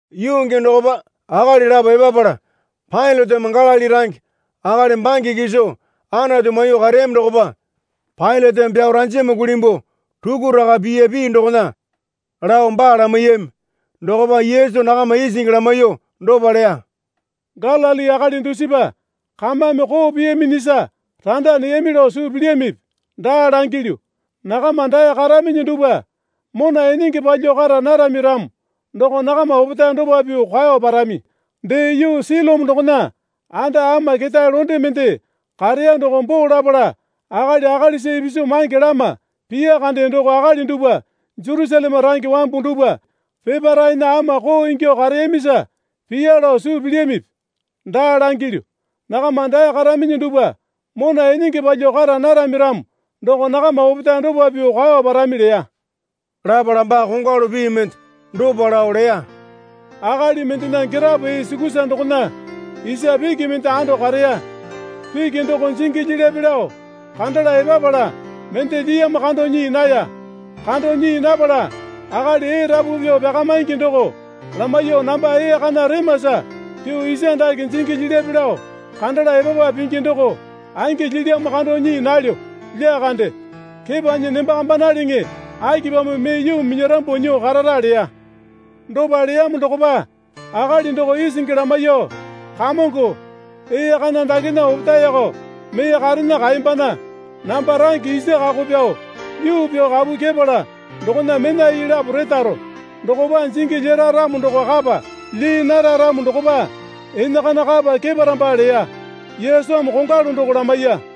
Yuu gii dokopa akali lapo epapala Pailateme Galili range akali bange kiso Anatu maiyuo kareyami dokopa Pailateme pyao ranjama kulimbuo rukuraka piya pii dokona lao baa lamaiyami. Dokopa Yesu nakama isingi lamaiyuo dopa leya. Galili akali dusipa kamame koo piyaminyisa randa neyami lao suu pilyamipi? Daa langilyu. Nakama dae karaminyi dupwa mona enenge palyuo kara narami ramo doko nakama opetae dopa pyuo kwao parami. Dee, yuu Silome dokona anda ama ketae londe mende kareya doko boo lapala akali akalisa ipisu mange lama piya kande doko akali dupwa Jerusaleme range wambu dupwa peparaena ama koo ingyuo kareyamisa piya lao suu pilyamipi? Daa langilyu. Nakama dae karaminyi dupwa mona enenge palyuo kara narami ramo doko nakama opetae dopa pyuo kwao parami leya. Lapala baa kongwalu pii mende dopa lao leya. Akali mendena girapo ee sukusa dokona isa piki mende ando kareya. Piki doko jingi lyilyape lao kandala epapala mende lyiyamo kando nyii naya. Kando nyii napala akali ee rapu pyuo pyakamaingi doko lamaiyuo namba ee kana remasa pyuo isa dake jingi lyilyape lao kandala epapa pingi doko angi lyilyamo kando nyii nalyo lyakande. Kepanyi nembakambanaleŋe akipamo mee yuu minyarambuo nyuo karara? leya. Dopa leyamo dokopa akali doko isingi lamaiyuo, Kamongo, ee kana dakena opetaeko mee karena kaembana. Namba range isa kako pyao yuu pyao kapu kyepala dokona mena ii lapo retaro. Dokopa jingi lyera ramo doko kapa. Lyii nara ramo dokopa enakana kapa keparamba, leya. Yesumi kongwalu doko lamaiya.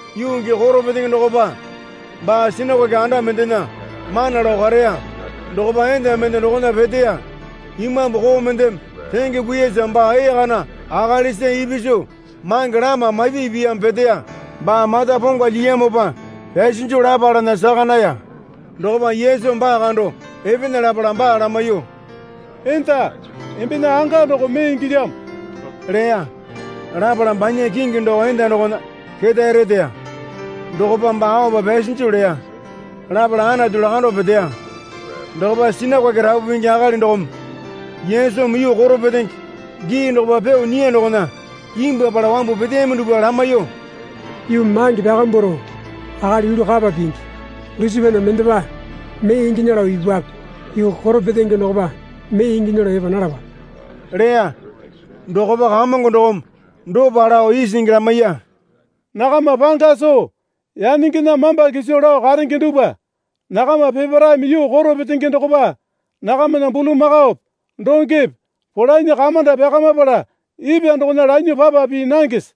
Yuu gii koro petenge dokopa baa sinakoke anda mendena mana lao kareya. Dokopa enda mende dokona peteya. Imambu koo mendeme renge kuiyasa baa ee kana akalisa ipisu mange lama mapi piyamo peteya. Baa mata ponga lyiyamopa pyasinju lapalana saka naya. Dokopa Yesumi baa kando epena lapala baa lamaiyuo, Enda, embena anga doko mee ingilyamo leya. Lapala banya kingi doko enda dokona ketae reteya. Dokopa baa aopa pyasinju leya. Lapala Anatu lakando peteya. Dokopa sinakoke rapu pingi akali dokome Yesumi yuu koro petenge gii dokopa pyuo nyiya dokona imbwuapala wambu peteyami dupwa lamaiyuo, Yuu mange pyakambwaro akali yulu kapa pingi. Dusipana mendepa mee inginya lao ipupwape. Yuu koro petenge dokopa mee inginya lao epa nalapape leya. Dokopa Kamongo dokome dopa lao isingi lamaiya. Nakama panga soo yanengena mamba kiso lao karenge dupwa, nakama peparaeme yuu koro petenge dokopa nakamana bulamakaope dongepe polanyi kamanda pyakamapala ipwa dokona lanyuo papa pii nangese?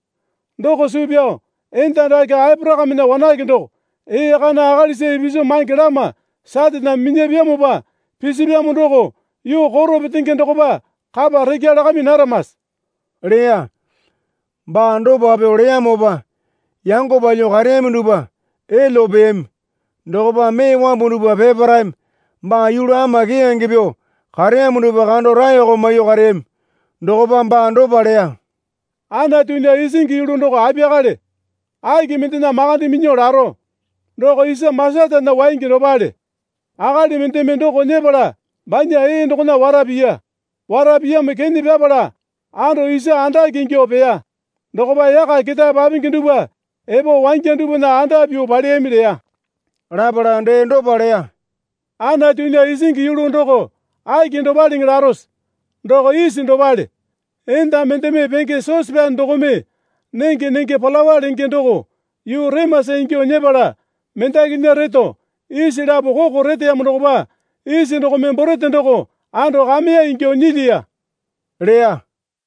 Doko suu pyao enda dake Aporakamena wanake doko ee kana akalisa ipisu mange lama Saraneme minyapyamopa pisipyamo doko yuu koro petenge dokopa kapa rekya lakami naramase? leya. Baa dopa pyuo leyamopa yango palyuo kareyami dupwa elyuo peyami. Dokopa mee wambu dupwa peparaeme baa yulu ama keyange pyuo kareyamo dupwa kando raeko maiyuo kareyami. Dokopa baa dopa leya. Anatunya isingi yulu doko apiyakale? Aki mendena makande minyuo laro? Doko isa masatana waingi dopale. Akali mendeme doko nyepala banya ee dokona wara piya. Wara piyamo kene pyapala ando isa andake ingyuo peya. Dokopa yaka ketae papingi dupwa epo wangya dupwana anda pyuo paleyami leya. Lapala dee dopa leya. Anatunya isingi yulu doko aki dopaleŋe larose? Doko isi dopale. Enda mendeme penge sosepyane dokome nenge nenge palawa lenge doko yuu remasa ingyuo nyepala mendakinya reto isi lapo koko reteyamo dokopa isi dokome borete doko ando kameya ingyuo nyilyiya leya.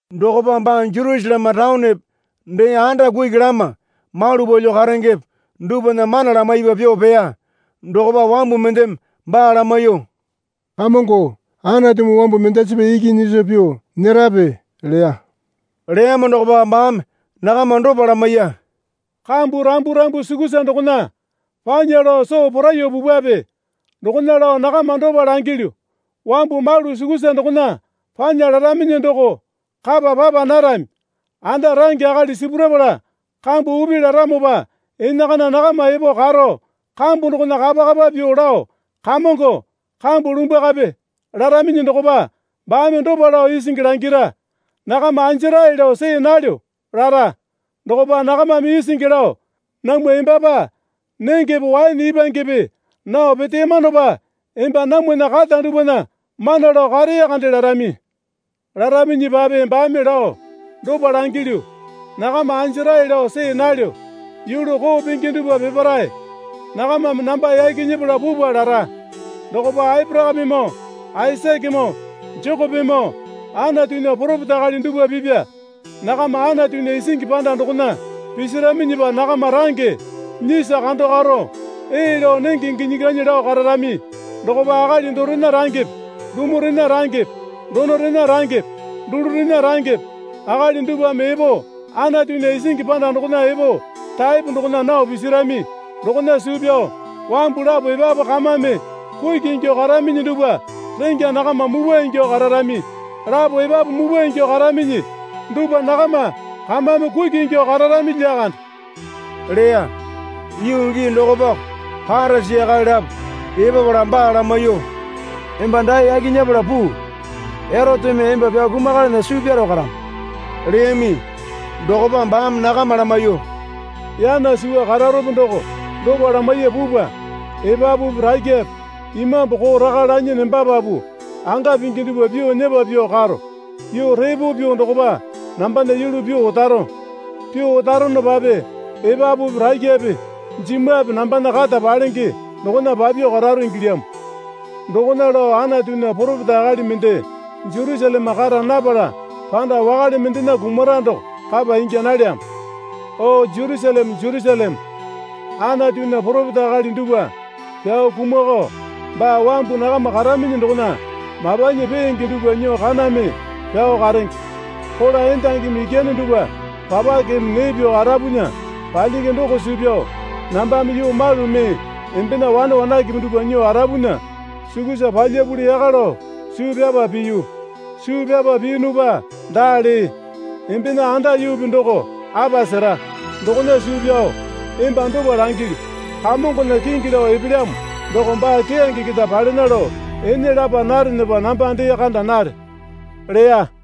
Dokopa baa Jerusaleme taonepe, dee anda kuki lama malu palyuo karengepe dupwana mana lamaipa pyuo peya. Dokopa wambu mendeme baa lamaiyuo, Kamongo, Anatumi wambu mendasipa iki nyiso pyuo nyerape? leya. Leyamo dokopa baame nakama dopa lamaiya. Kambu rambu rambu sukusa dokona panya lao soo poraiyuo pupwape. Dokona lao nakama dopa langilyu, Wambu malu sukusa dokona panya laraminyi doko kapa papa narami. Anda range akali sipurapala kambu upi laramopa enakana nakama epo karo kambu dokona kapa kapa pyuo lao, Kamongo, kambu lumbwakape, laraminyi dokopa baame dopa lao isingi langira. Nakama anjarae lao see nalyo, lara. Dokopa nakamame isingi lao, Namwa embapa nengepe waene ipwangepe nao peteyamanopa emba namwana kata dupwana mana lao karee kande larami. Laraminyipape baame lao, Dopa langilyu, nakama anjarae lao see nalyo. Yulu koo pingi dupwa peparae nakamame namba yaki nyepala pupwa, lara. Dokopa Aporakamemoo Aisakemoo Jekopemoo Anatunya poropeta akali dupwa pipya nakama Anatunya isingi panda dokona pisiraminyipa nakama range nyiso kando karo ee lao nenge ginyi ganyi lao kararami. Dokopa akali dorena rangepe dumurena rangepe donorena rangepe dulurena rangepe akali dupwame epo Anatunya isingi panda dokona epo taepo dokona nao pisirami. Dokona suu pyao wambu lapo epapu kamame kuki ingyuo karaminyi dupwa rengya nakama mupwa ingyuo kararami. Lapo epapu mupwa ingyuo karaminyi dupwa nakama kamame kuki ingyuo kararami lyakande, leya. Yuu gii dokopako Parisi akali lapo epapala baa lamaiyuo, Emba dae yaki nyepala puu. Eroteme emba pyao kumakalana suu pyaro karamo leyami. Dokopa baame nakama lamaiyuo, Yana suwa kararope doko dopa lamaiye pupwa. Epapupi rakyape imambu koo raka lanyi nembapapu anga pingi dupwa pyuo nyepa pyuo karo. Yuu repo pyuo dokopa nambana yulu pyuo otaro. Pyuo otaronopape epapupi rakyape jimwape nambana kata palenge dokona papyuo kararo ingilyamo. Dokona lao Anatunya poropeta akali mende Jerusaleme kara napala panda wakale mendena kumara doko kapa ingya nalyamo. O Jerusaleme, Jerusaleme, Anatunya poropeta akali dupwa pyao kumwakao baa wambu nakama karaminyi dokona mapanyi peenge dupwa nyuo kaname pyao karenge. Kola endangimi ikyane dupwa papakeme nee pyuo arapunya palyingi doko suu pyao nambame yuu malu mee embena wane wanakepe dupwa nyuo arapunya sukusa palyapuli yaka lao suu pyapa piyu. Suu pyapa piyunupa daa lee. Embena anda yuupi doko apa sera. Dokona suu pyao emba dopa langilyu. Kamongona kingi lao epelyamo doko baa keyange keta palena lao ene lapa narenepa namba dee kanda nare leya.